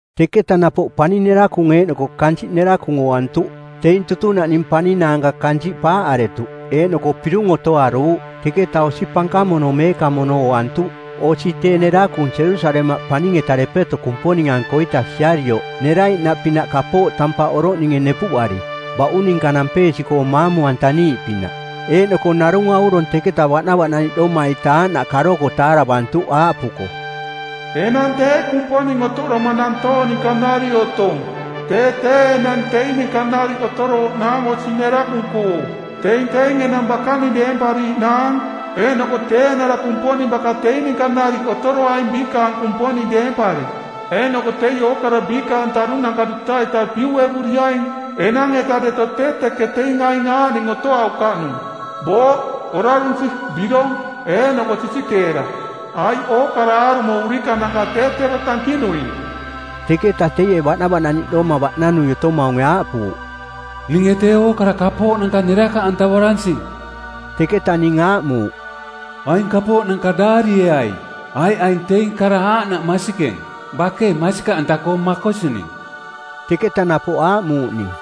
Teketa napoꞌ paning nerakung eeꞌnoko kansiꞌ nerakung ooantuꞌ, teing tutunaꞌning paning naanka kansiꞌ paaꞌaretuꞌ eeꞌnoko pirung otoaruuꞌ. Teketa osi pankamono meekamono ooantuꞌ, osi tee nerakung Jerusalemaꞌ paning-eta depeto Kumponing-ankoita siarioꞌ neraiꞌnaꞌpinaꞌ kapooꞌ tampaꞌ oroꞌninge nepuꞌari baꞌung ninka nampeesi-koo maamu-antaniiꞌpinaꞌ. Eeꞌnoko narung aurong teketa baꞌnavaꞌnaniꞌdoma-ita aaꞌnaꞌ karoko taaravantuꞌ aaꞌpuko, “Enang tee Kumponing otoꞌdoma nantoong ninka nariꞌ otong, tee tee enang teing ninka nariꞌ otorooꞌnaang osi nerakung-koo. Teing teing enang bakaning deempariiꞌnaang, eeꞌnoko tee eeꞌnara Kumponing baka teing ninka nariꞌ otoroaing biikaang Kumponing deempari. Eeꞌnoko teie ookara biikaang taꞌdunanka duta-ita piuꞌevuriaing. Enang-eta deto tee teke teing aing aaꞌning otoaukaꞌnung: booꞌ, orarunsi, birong, eeꞌnoko sisikeera, aiꞌ ookara aarumo urikananka tee tero tankinuing.” Teketa teie baꞌnavaꞌnaniꞌdoma baꞌnanui otomaunge aaꞌpuuꞌ, “Ninge tee ookara kapooꞌnanka nerakaꞌantavaransing.” Teketa ning aaꞌmuuꞌ, “Aing kapooꞌnanka daarieai, aiꞌ aing teing kara aaꞌnaꞌ masikeng, bakei masikaꞌanta-koo makosining.” Teketa napoꞌ aaꞌmuuꞌ ning,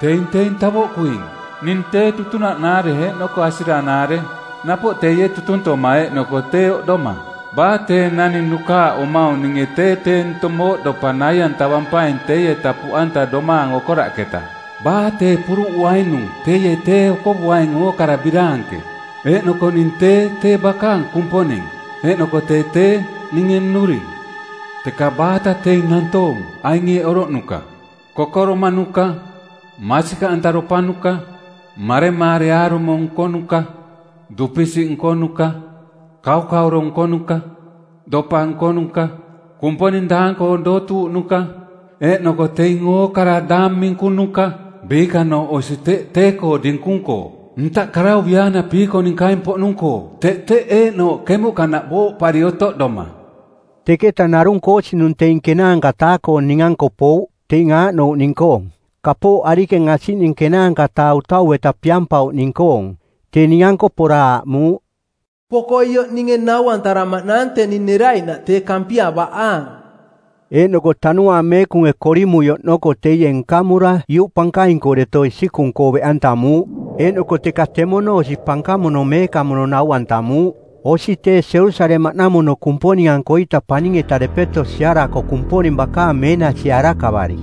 “Teing teing tavoꞌkuing. Ning tee tutunaꞌnaare eeꞌnoko asiranaare, napoꞌ teie tutuntoma eeꞌnoko tee oꞌdoma. Baa tee naning nukaaꞌomaung ninge tee tee ntong mooꞌdopa nai-antavampaing teieta puꞌanta domaang okoraꞌketa. Baa tee puruꞌuainung teie tee okovuaing ookara biraanke. Eeꞌnoko ning tee, tee bakaang Kumponing eeꞌnoko tee tee ninge nnuring. Teka baata teing nantoong aing eeꞌ oroꞌnuka: kokoromaꞌnuka, masikaꞌantaropanuka, maremaare aarumo nkonuka, dupisiꞌ nkonuka, kaukauro nkonuka, dopa nkonuka, kumponing daang-koong dootuuꞌnuka, eeꞌnoko teing ookara daang minkunuka, biikanooꞌ osi teꞌ tee-koo dinkung-koo ntaꞌ karauviaana piikoninkaing-poꞌnung-koo teꞌ teꞌ eeꞌnooꞌ kemuꞌkanaꞌ booꞌpari otoꞌdoma.” Teketa narung koosinung teing ˜kenaanka-taa-koong ning-anko pouꞌ teing aaꞌnouꞌning-koong: kapooꞌ arikeng asiꞌning ˜kenaanka-taa utau-eta piampauꞌning-koong. Tee ning-anko pora aaꞌmuuꞌ, “Poko ioꞌ ninge nau-antaramaꞌnaang teni neraiꞌnaꞌ tee Kampia baꞌaang.” Eeꞌnoko Tanuaang Meekunge korimui oꞌnoko teie nkamura iuꞌ pankaing-koo deto isikung-koo beꞌantamuuꞌ eeꞌnoko teka temono osi pankamono meekamono nau-antamuuꞌ, osi tee Jerusalemaꞌnamono Kumponing-ankoita paning-eta depeto siarako Kumponing bakaang meenasie arakavari.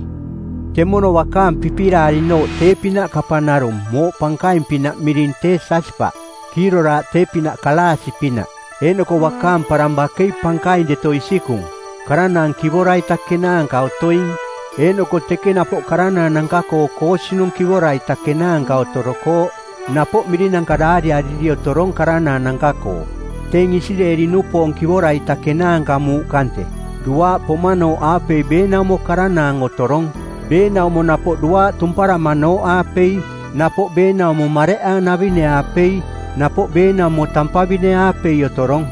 Temono bakaang pipiraari-nooꞌ tee-pinaꞌ kapang narung mooꞌ pankaing-pinaꞌ miring tee jasipaꞌ, kiiroraaꞌ tee-pinaꞌ kalaasi-pinaꞌ. Eeꞌnoko bakaang parang bakei pankaing deto isikung, karanaang kivora-ita kenaanka otoing. Eeꞌnoko teke napoꞌ karanaananka-koo koosinung kivora-ita kenaanka otorokooꞌ, napoꞌ mirinanka daariari otorong karanaananka-koo, teing Isireeli-nupoong kivora-ita kenaanka muuꞌ kante. Duaaꞌ pomanooꞌaapei beenaumo karanaang otorong, beenaumo napoꞌ duaaꞌ tumparamanooꞌaapei, napoꞌ beenaumo mareꞌaanavine-aapei, napoꞌ beenaumo tampavine-aapei otorong.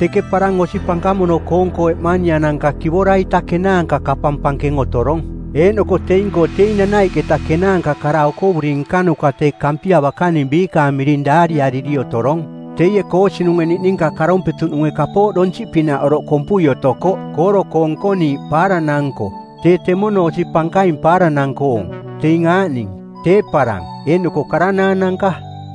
Teke parang osi pankamono-koong-koo eꞌmania-nanka kivora-ita kenaanka kapang pankeng otorong eeꞌnoko teing-koo teing nanaiꞌketa kenaanka kara okovuri nkanuka tee Kampia bakaning biikaang miring daariariri otorong. Teie koosinunge niꞌninka karompetuꞌnunge kapooꞌ donsiꞌpinaꞌ oroꞌ kompui otokoꞌ kooro-koo nkoniiꞌ paaranang-nko, tee temono osi pankaing paaranang-koong, teing aaꞌning: tee parang eeꞌnoko karanaananka.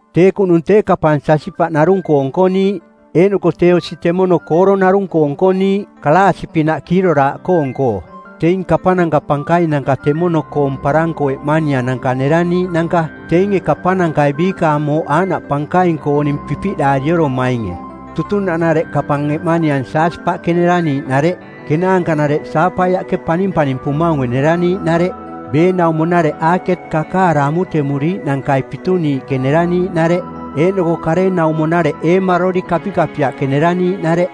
Tee kuꞌnung tee kapang jasipaꞌ narung-koo nkoniiꞌ, eeꞌnoko tee osi temono kooro narung-koo nkoniiꞌ, kalaasi-pinaꞌ kiiroraaꞌkoong-koo. Teing kapananka pankainanka temono-koong parang-koo eꞌmaniananka neraniiꞌnanka teinge kapanankai biikaang mooꞌ aaꞌnaꞌ pankaing-kooning pipiꞌdaariomainge. Tutunaꞌnareꞌ kapang eꞌmaniang jasipaꞌke neraniiꞌnareꞌ. Kenaanka-nareꞌ saapaiaꞌke panimpanimpumaunge neraniiꞌnareꞌ. Beenaumo-nareꞌ aaket kakaara amutemuriiꞌnankai pituniiꞌke neraniiꞌnareꞌ. Eeꞌnoko karenaumo-nareꞌ eemaroli kapikapiaꞌke neraniiꞌnareꞌ.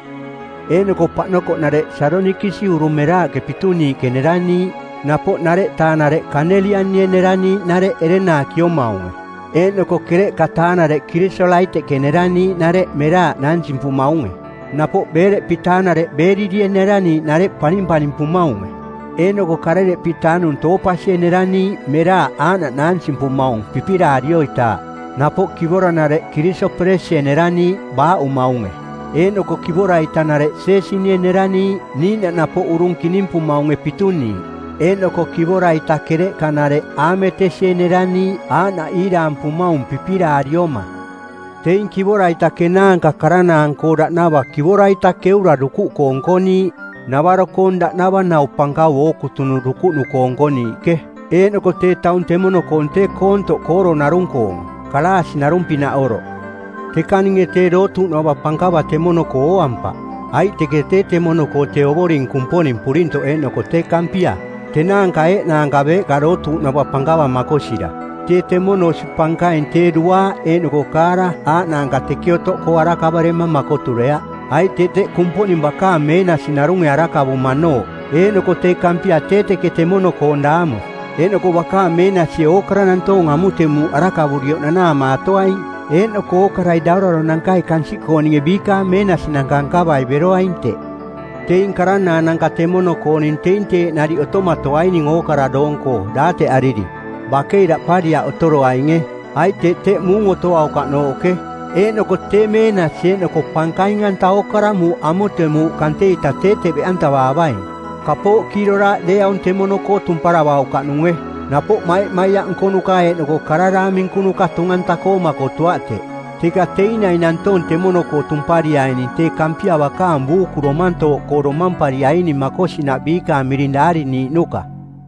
Eeꞌnoko paꞌnokoꞌnareꞌ sadonikis urung meraaꞌke pituniiꞌke neraniiꞌ. Napoꞌ ˜nareꞌtaa-nareꞌ kaneliani-e neraniiꞌnareꞌ ereng naakiomaunge. Eeꞌnoko ˜kereꞌka-taa-nareꞌ kirisolaiteꞌke neraniiꞌnareꞌ meraaꞌ naansimpumaunge. Napoꞌ ˜beereꞌpi-taa-nareꞌ beerili-e neraniiꞌnareꞌ panimpanimpumaunge. Eeꞌnoko ˜karereꞌpi-taa-nung toopasi-e neraniiꞌ meraaꞌ aaꞌnaꞌ naansimpumaung pipiraarioitaaꞌ. Napoꞌ kivora-nareꞌ kirisoperesi-e neraniiꞌ baaꞌumaunge, eeꞌnoko kivora-itanareꞌ jeesini-e neraniiꞌ niiꞌnaꞌ napoꞌ urung kinimpumaunge pituniiꞌ. Eeꞌnoko kivora-ita kereꞌka-nareꞌ aametesi-e neraniiꞌ aaꞌnaꞌ iiraampumaung pipiraarioma. Teing kivora-ita kenaanka karanaang-koong daꞌnava kivora-ita keura dukuꞌkoo nkoniiꞌ, navaro-koong daꞌnava nau pankau ookutunung dukuꞌnu-koo nkoniiꞌke. Eeꞌnoko tee taung temono-koong tee koontoꞌ kooro narung-koong, kalaasi narung-pinaꞌ oroꞌ. Teka ninge tee dootuuꞌnava pankava temono-koo ooampaꞌ, aiꞌ teke tee temono-koo tee Ovoring Kumponing Purintoꞌ eeꞌnoko tee Kampia, tenaanka eeꞌnaanka beeꞌka dootuuꞌnava pankava makosira. Tee temono osi pankaing tee duaaꞌ eeꞌnoko kaara aaꞌnaanka teke otoꞌkoo arakavarema makotureaꞌ, aiꞌ teꞌ teꞌ Kumponing bakaang meenasi narunge arakavumanooꞌ, eeꞌnoko tee Kampia tee teke temono-koong daamu. Eeꞌnoko bakaang meenasie ookara nantoong amutemuuꞌ arakavurioꞌ nanaamatoaing, eeꞌnoko ookarai dauraronankai kansiꞌkooninge biikaang meenasinanka nkavai beroaing teꞌ. Teing karanaananka temono-kooning teing teeꞌ nariꞌ otomatoaining ookara doong-koo daateꞌariri. Bakei daꞌpariaꞌ otoroaininge, aiꞌ teꞌ teꞌ muung otoaukaꞌnooꞌke. Eeꞌnoko tee meenasi eeꞌnoko pankaing-anta ookara muuꞌ amutemuuꞌ kante-ita tee teꞌ beꞌantavaavaing. Kapooꞌ kiiroraaꞌ deeaung temono-koo tumparavaukaꞌnunge, napoꞌ maimaiaꞌ nkonuka eeꞌnoko kara daang minkunuka tung-anta-koo makotuaꞌ teꞌ. Teka teing naing nantoong temono-koo tumpariaining tee Kampia bakaang buuku domantooꞌkoo domampariaining makosinaꞌ biikaang miring daariniiꞌnuka.